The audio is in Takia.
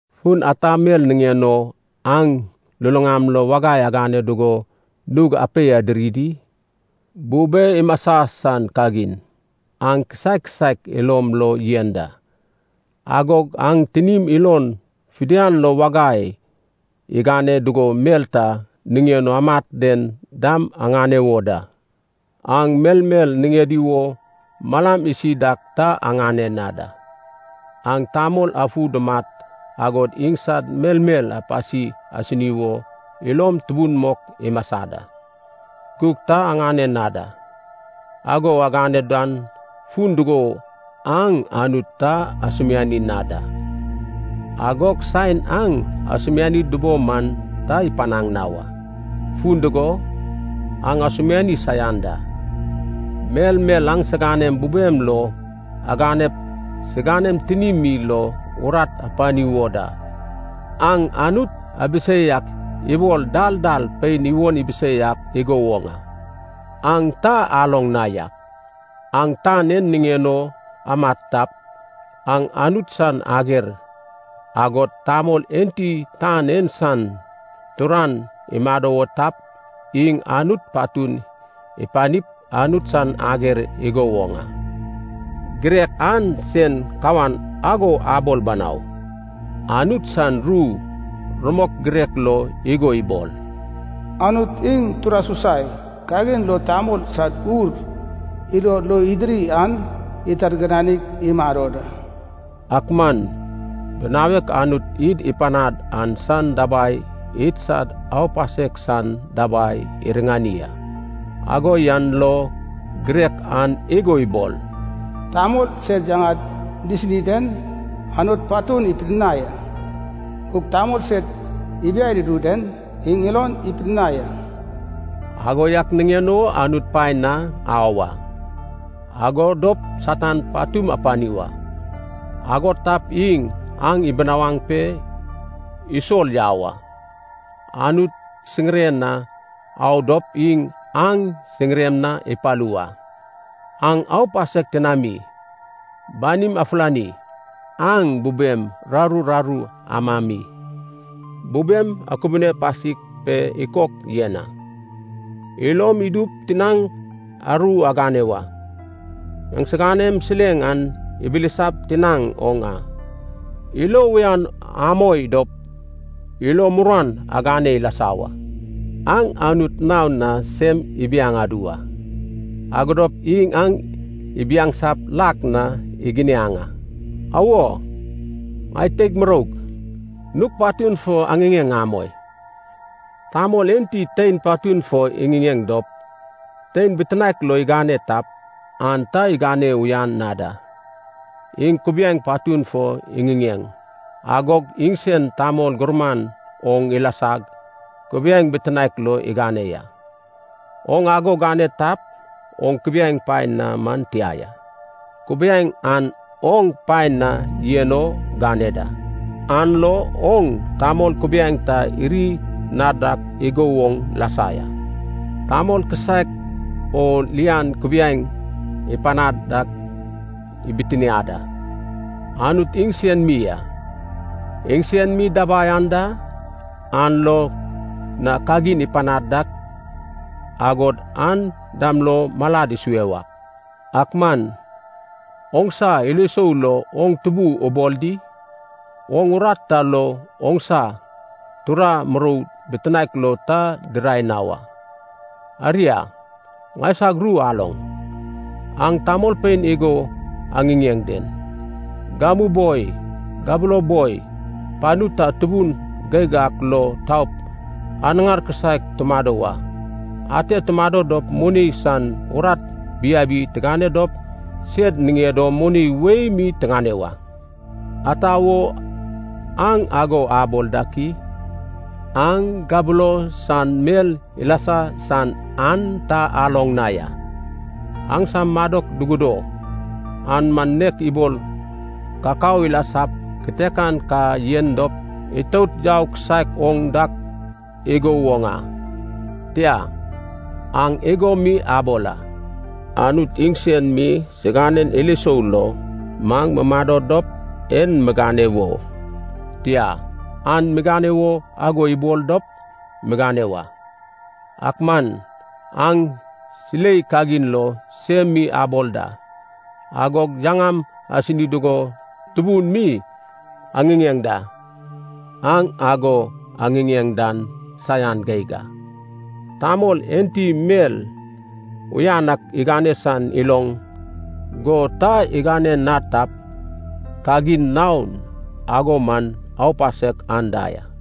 Fun ata mel niŋen o aŋ luluŋam lo wagai agane dugo nug apei adiri di? Bube imasa san kagin aŋ kisaek kisaek ilom lo yen da, agog aŋ tinim ilon fidian lo wagai igane dugo mel ta niŋen o amat den dam aŋane wo da. Aŋ melmel niŋedi wo malam isi dak ta aŋane na da. Aŋ tamol afu dumat agod iŋsad melmel apasi asini wo ilom tubun mok imasa da, gug ta aŋane na da. Ago agane dan fun dugo aŋ Anut ta asumiani na da. Agog saen aŋ asumiani dubo man ta ipanaŋ na wa, fun dugo aŋ asumiani saian da. Melmel aŋsiganem bubem lo aganep siganem tinim mi lo urat apani wo da. Aŋ Anut abisei ak ibol dal dal pein iwon ibisei ak igo woŋ a. Aŋ ta aloŋ na yak, aŋ tan en niŋen o amat tap, aŋ Anut san ager. Agog tamol enti tan en san turan imado wo tap, iŋ Anut patun ipanip Anut san ager igo woŋ a. Girek an sen kawan ago abol banau, Anut san ru rumok girek lo igo ibol, “Anut iŋ tura susai kagin lo tamol sad ur ilod lo idiri an itargiranig imado da.” Ak man binawek Anut id ipanad an san dabai idsad aupasek san dabai iriŋani a. Ago yan lo girek an igo ibol, “Tamol sed yaŋad disini den Anut patun ipidinai a, gug tamol sed ibiai dudu den iŋ ilon ipidinai a.” Ago yak niŋen o Anut paen na au a. Ago dop Satan patum apani wa. Ago tap iŋ aŋ ibisawaŋ pe isol yau a. Anut siŋiren na au dop iŋ aŋ siŋirem na ipalu wa. Aŋ aupasek tinami, banim afulani. Aŋ bubem raru raru amami, bubem akubune pasik pe ikok yen a. Ilom idup tinaŋ aru agane wa. Aŋsiganem sileŋ an abilisap tinaŋ oŋ a. Ilo uyan amoi dop ilo muruan agane ilasa wa. Aŋ Anut naon na sem ibiaŋ adu wa, ago dop iŋ aŋ ibiaŋsap lak na iginiaŋ a. Awo, ŋai teig muroug, nug patun fo aŋiŋeŋ amoi. Tamol enti tein patun fo iŋiŋeŋ dop tein bitinaek lo igane tap, an ta igane uyan na da. Iŋ kubiaeŋ patun fo iŋiŋeŋ, agog iŋsen tamol gurman oŋ ilasag, kubiaeŋ bitinaek lo igane ya. Oŋ ago gane tap, oŋ kubiaeŋ paen na man tia ya. Kubiaeŋ an oŋ paen na yen o gane da. An lo oŋ tamol kubiaeŋ ta iri na dak igo woŋ lasa ya. Tamol kisaek o lian kubiaeŋ ipanad dak ibitiniad a, Anut iŋsen mi a. Iŋsen mi dabai anda, an lo na kagin ipanad dak agod an dam lo malad isue wa. Ak man oŋsa ilo isou lo oŋ tubu ubol di? Oŋ urat ta lo oŋsa tura murou bitinaek lo ta dirai na wa. Aria, ŋaisag ru aloŋ, aŋ tamolpein igo aŋiŋeŋ den, “Gamu boi gabulo boi panu ta tubun geig ak lo taup anaŋar kisaek tumado wa. Ate tumado dop moni san urat biabi tigane dop sed niŋed o moni wei mi tiŋane wa.” Ata wo aŋ ago abol dak i? Aŋ gabulo san mel ilasa san an ta aloŋ na ya. Aŋsam madok dugudo, an man nek ibol kakao ilasap kitekan ka yen dop itout yau kisaek oŋ dak igo woŋ a. Tia, aŋ igo mi abol a, “Anut iŋsen mi siganen ilo isou lo, maŋ mumado dop en migane wo, tia, an migane wo, ago ibol dop migane wa” Ak man aŋ silei kagin lo sem mi abol da, agog yaŋam asini dugo tubun mi aŋiŋeŋ da. Aŋ ago aŋiŋeŋ dan saian geig a. Tamol enti mel uyan ak igane san iloŋ, go ta igane na tap, kagin naon ago man aupasek anda ya.